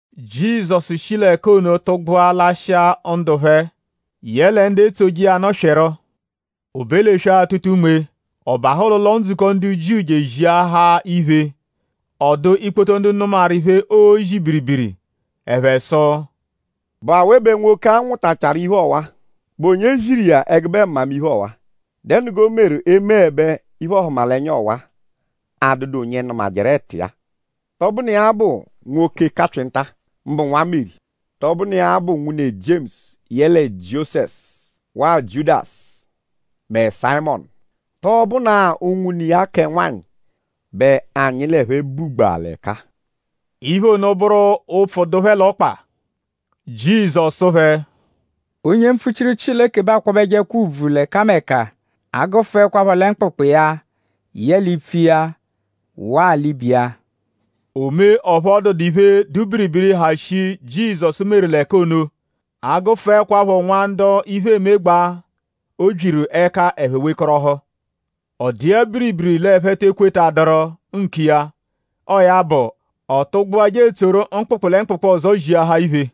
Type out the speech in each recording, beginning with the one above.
Jizọsu shi l'ẹka ono tụgbua lashịa ndu phẹ; yẹle ndu etsoje iya nụ swịru. O be l'eswe-atụta-unme; ọ bahụ l'ụlo-ndzukọ ndu Jiu je eziahaa iphe. Ọ dụ ikpoto ndu nụmaru iphe, oozi biribiri. Ẹphe sụ: “?Bụ awe bẹ nwoke-a nwụtachaaru iphe ọwa??Bụ onye ziru iya ẹgube mmamiphe ọwa??Dẹnu g'o meru emeẹbe iphe-ọhumalenya ọwa-a, adụdu onye nụmajeru ẹtu iya-a? ?Tọ bụnu iya-a bụ nwoke kapyịnta-a; mbụ nwa Meri??Tọ bụnu iya bụ nwune Jiemusu yẹle Jiosẹsu; waa Jiudasu; mẹ Sayịmonu??Tọ bụnaa unwune iya kẹ nwanyị bẹ anyi l'ẹphe bugbaa l'ẹka-a?” Iphe ono bụru ụpfu dụ phẹ l'ọkpa. Jizọsu sụ phẹ: “Onye mpfuchiru Chileke bẹ aakwabẹjekwa ùbvù l'ẹkameka; a -gụfuekwapho lẹ mkpụkpu iya yẹle ipfu iya; waa l'ibe iya.” O mee ọphu ọ dụdu iphe, dụ biribiri, ha shii, Jizọsu meru l'ẹka ono; a -gụfuekwapho nwa ndu iphe emegbaa, o byiru ẹka; ẹphe wekọrohu. Ọ dụ iya biribiri l'ẹphe te ekwetaduru nkiya. Ọo ya bụ; ọ tụgbua je etsoru mkpụkpu lẹ mkpụkpu ọzo ziahaa iphe.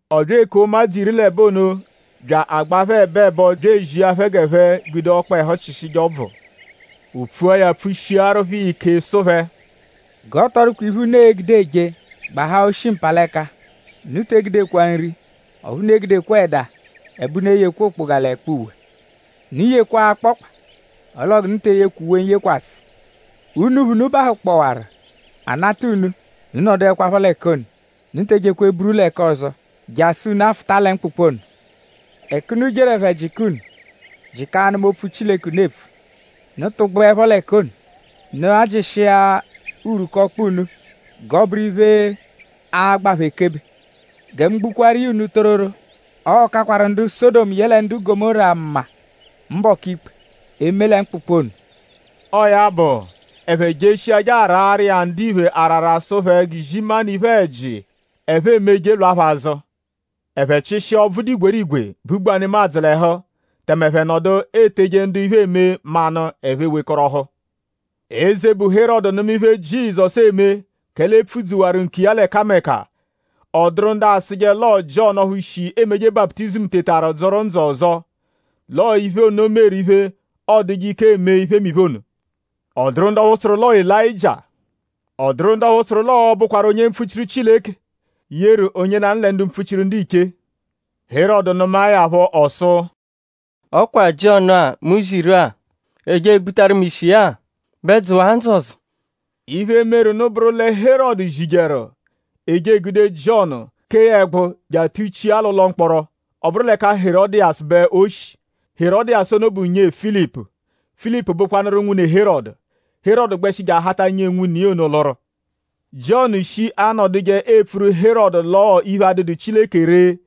Ọ bya ekua ụmadzu iri l'ẹbo ono bya agbaa phẹ ẹbo ẹbo bya ezia phẹ g'ẹphe gude ọkpehu chịshije ọbvu. O pfua ya pfushiaru phẹ iya ike sụ phẹ: “G'ọ tọ dụkwa iphe, unu e-gude eje; gbahaa oshi-mpalẹka. Unu te egudekwa nri; ọphu unu egudekwa ẹda; ẹbe unu eyekwa okpoga l'ẹkpa uwe. Unu yekwaa akpọkpa; ọl'oo g'unu te eyekwa uwe n-yekwasẹ. Unuphu, unu bahụkpowaru; a -nata unu; unu nọduekwapho l'ẹka ono. Unu te ejekwa eburu l'ẹka ọzo jasụ unu afụta lẹ mkpụkpu ono. Ẹka unu jeru; ẹphe -jịka unu; jịka anụma opfu Chileke, unu epfu; unu -tụgbujeepho l'ẹka ono; unu ajịshia urwuku ọkpa unu; g'ọ bụru iphe, a-gba phẹ ekebe. Gẹ mu gbukwaaru iya unu tororo; ọo-kakwaru ndu Sọdomu yẹle ndu Gọmóra mma mbọku ikpe; eme lẹ mkpụkpu ono.” Ọo ya bụ; ẹphe jeshia je araru iya ndiphe arara sụ phẹ g'izimanụ iphe-ẹji, ẹphe emeje lwa phẹ azụ. Ẹphe chịshia ọbvu, dụ igwerigwe, bugbaa nemadzụ l'ẹhu; tẹme ẹphe nọdu eteje ndu iphe eme manụ; ẹphe ewekọrohu. Eze, bụ Herọdu nụma iphe, Jizọsu eme; kẹle e pfudzuwaru nkiya l'ẹkameka. Ọ dụru ndu asụje l'ọo Jiọnu ọphu shi emeje baputizimu tetaru dzụru ndzụ ọzo; l'ọo iphe ono meru iphe, ọoduje ike eme iphemiphe ono. Ọ dụru ndu ọphu sụru l'ọo Elayịjia. Ọ dụru ndu ọphu sụru l'ọo-bụkwaru onye mpfuchiru Chileke, yeru onye lanụ lẹ ndu mpfuchiru ndiche. Herọdu nụmae ya phọ ọ sụ: “Ọ kwa Jiọnu-a, mu ziru; e je egbutaru mu ishi iya-a bẹ dzụwaa ndzụ ọzo.” Iphe, meru nụ bụru lẹ Herọdu zijeru; e je egude Jiọnu; kee ya ẹgbu; je atuchia l'ụlo mkpọro. Ọ bụru l'ẹka Herọdiyasu bẹ o shi. Herọdiyasu ono bụ nyee Filipu. Filipu bụkwanu nwune Herọdu. Herọdu gbẹshi je ahata nyee nwune iya ono lụru. Jiọnu shi anọduje epfuru Herọdu l'ọo iphe, adụdu Chileke ree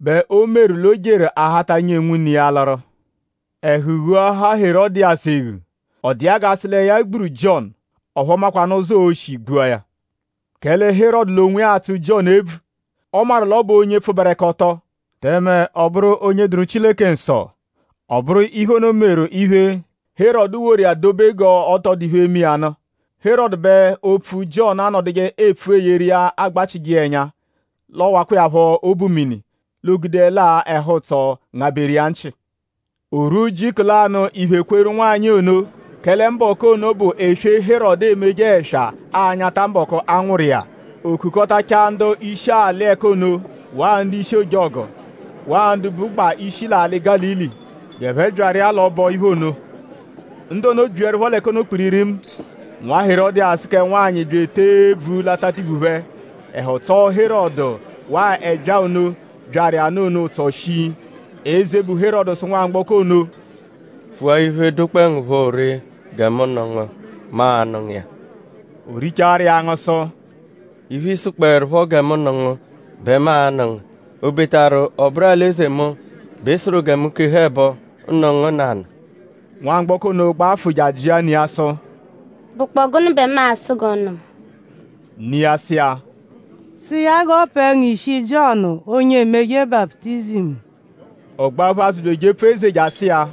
bẹ o meru l'o jeru ahata nyee nwune iya lụru. Ẹhu ghuahaa Herọdiyasu eghu. Ọ dụ iya gẹ a sụ lẹ ya gburu Jiọnu; ọphu ọ makwanụ ụzo, oo-shi gbua ya; kẹle Herọdu l'onwiya atsụ Jiọnu ebvu. Ọ maru l'ọ bụ onye pfụberekoto; tẹme ọ bụru onye dụru Chileke nsọ. Ọ bụru iphe ono meru iphe, Herọdu woru iya dobe g'ọ tọ dụ iphe, e-me iya nụ. Herọdu bẹ opfu, Jiọnu anọduje epfuru iya agbachịje ẹnya; l'ọowakwa iya phọ obu mini; l'o gudeẹle-a ẹhu-ụtso ngabẹru iya nchị. O rwua ujiku lanụ iphe kweru nwanyị ono; kẹle mbọku ono bụ eswe, Herọdu emeje ẹswa anyata mbọku, a nwụru iya. O kukọtachaa ndu-ishi alị ẹka ono; waa ndu-ishi ojọgu; waa ndu bụgbaa ishi l'alị Gálili g'ẹphe byaru iya l'ọbo-iphe ono. Ndu ono byiẹrupho l'ẹka ono kpiririmu; nwa Herọdiyasu kẹ nwanyị bya etee ebvu l'atatiphu phẹ. Ẹhu tsọo Herọdu waa ẹbyaa ono, byaru iya nụ ono ụtso shii. Eze, bụ Herọdu sụ nwamgbọko ono: “Pfua iphe, dụkpoe ngu phọ ree gẹ mu nụ ngu; mu a-nụ ngu iya.” O richaaru iya angụ sụ: “Iphe, ị sụkpoerupho gẹ mu nụ ngu bẹ mu a-nụ ngu; obetaru ọ bụru alị-eze mu bẹ ị sụru gẹ mu keha ẹbo; nụ ngu nanụ.” Nwamgbọko ono gbafụ je ajịa ne iya sụ: “?Bụkpoo gụnu bẹ mu a-sụ g'ọ nụ mu?” Ne iya sụ iya: “Sụ iya g'ọ pẹe ngu ishi Jiọnu, onye emeje baputizimu.” Ọ gbaphu azụ bya ejepfu eze je asụ iya: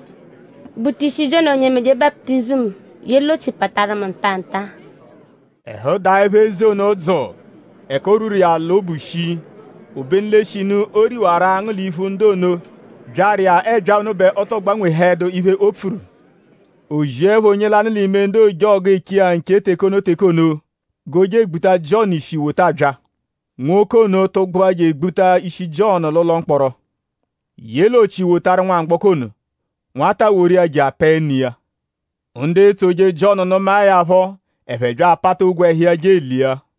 “Gbuta ishi Jiọnu, onye emeje baputizimu ye l'ochi pataru mu nta-a nta-a.” Ẹhu daẹpho eze ono dzụu; ẹka o rwuru iya l'obu shii. Obenu l'eshinu o riwaru angụ l'iphu ndu ono, byaru iya ẹbyaa ono bẹ ọ tọo gbanwehẹdu iphe, o pfuru. O ziẹpho onye lanụ l'ime ndu ojọgu, eche iya nche teke ono teke ono g'o je egbuta Jiọnu ishi wota bya. Nwoke ono tụgbua je egbuta ishi Jiọnu l'ụlo mkpọro ye l'ochi wotaru nwamgbọko ono. Nwata woru iya je apẹe ne iya. Ndu etsoje Jiọnu nụmae ya phọ; ẹphe bya apata ogwe iya je elia.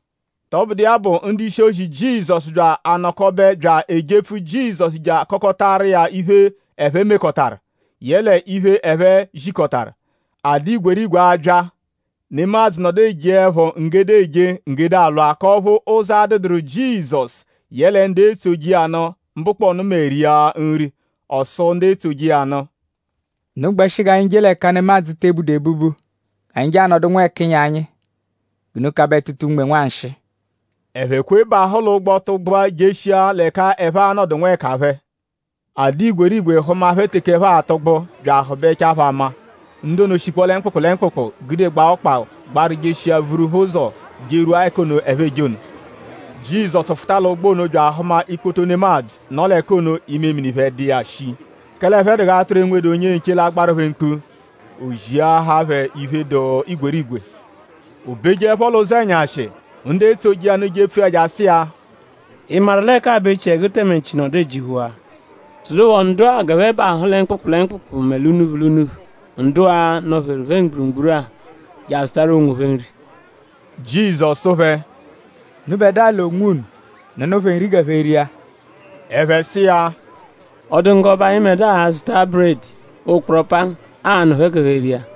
Tọbudu iya bụ; ndu-ishi-ozi Jizọsu bya anọkobe bya ejepfu Jizọsu je akọkotaru iya iphe, ẹphe mekọtaru; yẹle iphe, ẹphe zikọtaru. A dụ igwerigwe abya. Nemadzụ nọdu ejeẹpho nggede eje; nggede alwa; k'ọphu ụzo adụduru Jizọsu yẹle ndu etsoje iya nụ mbụkponu mẹ ria nri. Ọ sụ ndu etsoje iya nụ: “Unu gbẹshi g'anyi je l'ẹka nemadzụ te ebudu ebubu g'anyi je anọdu nwẹkinyi anyi g'unu kabẹ tụta unme nwanshịi.” Ẹphe kwe bahụ l'ụgbo tụgbua jeshia l'ẹka ẹphe a-nọdu nwẹkaphe. A dụ igwerigwe hụma phẹ teke ẹphe atụgbu bya ahụbechaa phẹ ama. Ndu ono shikpọo lẹ mkpụkpu lẹ mkpụkpu gudegbaa ọkpa gbaru jeshia vuru phẹ ụzo jerwua ẹka ono, ẹphe eje ono. Jizọsu fụta l'ụgbo ono bya ahụma ikpoto nemadzụ, nọ l'ẹka ono; imemini phẹ dụ iya shii; kẹle ẹphe dụ g'atụru, enwedu onye-nche, l'agbaru phẹ mkpu. O ziahaa phẹ iphe, dụ igwerigwe. O bejeẹpho l'ụzenyashi; ndu etsoje iya nụ jepfu iya je asụ iya: “?Ị maru l'ẹka-a bụ echiẹgu tẹme nchi nọdu ejihuwaa?” Sụdupho ndu-a g'ẹphe bahụ lẹ mkpụkpu lẹ mkpụkpu mẹ l'unuphu l'unuphu ndu-a, nọ-pheru phẹ mgburugburu-a je azụtaru onwophẹ nri. Jizọsu sụ phẹ: “Unubẹdua l'onwunu nụnu phẹ nri g'ẹphe ria.” Ẹphe sụ iya: “?Ọ dụ ngu g'ọ bụ anyịbedua a-zụta buredi, ụkporo pangu, aa-nụ phẹ g'ẹphe ria?”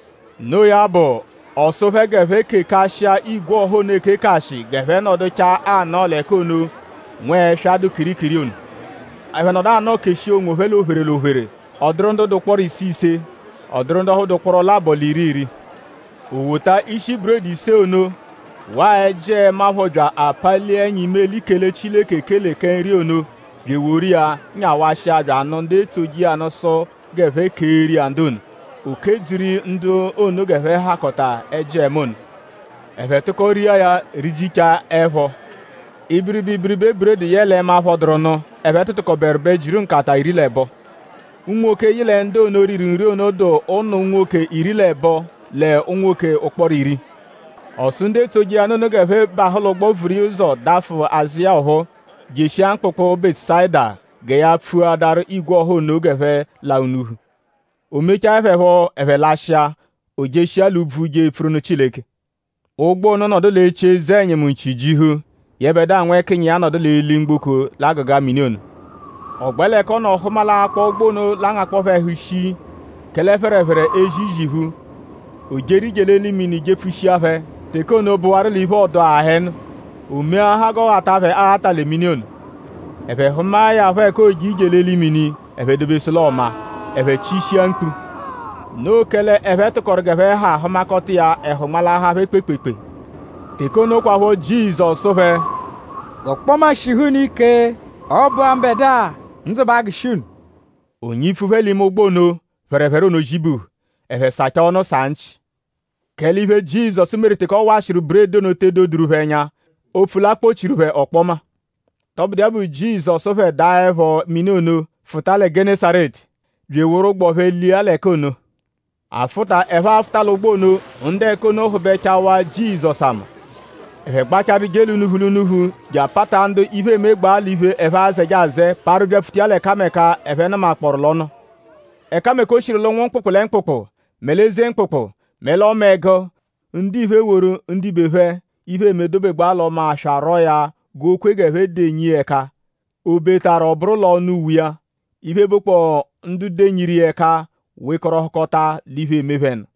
Noo ya bụ; ọ sụ phẹ g'ẹphe kekashịa igwe ọha ono ekekashị g'ẹphe nọduchaa anọo l'ẹka ono, nwẹswa dụ kirikiri ono. Ẹphe nọdu anọo keshia onwophẹ l'ophere l'ophere; ọ dụru ndu dụ ụkporo ise ise; ọ dụru ndu ọphu dụ ụkporo labọ l'iri iri. O wota ishi buredi ise ono; waa ẹji-ẹma phọ bya apalia ẹnya imeli kele Chileke ekele kẹ nri ono; bya eworu iya nyawashia bya anụ ndu etsoje iya nụ sụ g'ẹphe keeru iya ndu ono. O kedzuru ndu ono g'ẹphe hakọta ẹji-ẹma ono. Ẹphe tụko ria ya; rijichaa ẹpho. Ibiribe ibiribe buredi yẹle ẹma, phọduru nụ, ẹphe tụtukoberu bẹ jiru nkata iri l'ẹbo. Unwoke, yị lẹ ndu ono, riru nri ono dụ ụnu unwoke iri l'ẹbo lẹ unwoke ụkporo iri. Ọ sụ ndu etsoje iya nụ ono g'ẹphe bahụ l'ụgbo; vuru iya ụzo; dafụ azụ iya ọphuu; jeshia mkpụkpu Bẹtusayida gẹ ya pfuadaru igwe ọha ono g'ẹphe la unuphu. O mechaẹ phẹ phọ ẹphe lashịa; o jeshia l'úbvú je epfuru nụ Chileke. Ụgbo ono nọdu l'echi eze-ẹnyimu nchi jihu; yẹbedua nwẹkinyiya nọdu l'eli-mgboko l'agụga mini ono. Ọ gbẹ l'ẹka ọ nọ hụma l'akpọ ụgbo ono l'angakpọo phẹ ẹhu shii; kẹle phẹrephere ezi iziphu; o jeru ije l'eli mini jepfushia phẹ. Teke ono bụwaru l'iphe-ọduu aha ẹnu. O meahaa g'ọo ghata phẹ aghata lẹ mini ono. Ẹphe hụmae ya phọ ẹka ooje ije l'eli mini; ẹphe dobesụ l'ọo maa. Ẹphe chishia mkpu. Noo kẹle ẹphe tụkoru g'ẹphe ha hụmakota iya; ẹhu nmalahaa phẹ kpeekpeekpee. Teke ono kwaphọ Jizọsu sụ phẹ: “G'ọkpoma shihu unu ike; ọ bụ-a mbẹdua. Ndzụ ba agụshi unu.” O nyipfu phẹ l'ime ụgbo ono; phẹrephere ono zibuhu. Ẹphe sachaa ọnu saa nchị; kẹle iphe, Jizọsu meru teke ọ washịru buredi ono te edoduru phẹ ẹnya; opfu l'a kpọ-chiru phẹ ọkpoma. Tọbudu iya bụ; Jizọsu phẹ daghaẹpho mini ono; fụta lẹ Gẹnesaretu; bya eworu ụgbo phẹ lia l'ẹka ono. Afụta, ẹphe afụta l'ụgbo ono; ndu ẹka ono hụbechawaa Jizọsu ama. Ẹphe gbachaarụ je l'unuphu l'unuphu je apata ndu iphe emegbaa l'iphe, ẹphe azẹje azẹe parụ byapfuta iya l'ẹkameka, ẹphe nụmakpooru l'ọ nọ. Ẹkameka, o shiru l'ụnwu mkpụkpu lẹ mkpụkpu; mẹ l'eze mkpụkpu; mẹ l'ọma ẹgu; ndiphe eworu ndibe phẹ, iphe eme dobegbaa l'ọma aswa rwọo ya g'o kwe g'ẹphe denyi iya ẹka; obetaru ọ bụru l'ọnu uwe iya. Iphe, bụkpoo ndu denyiru iya ẹka wekọrohukota l'iphe, eme phẹ nụ.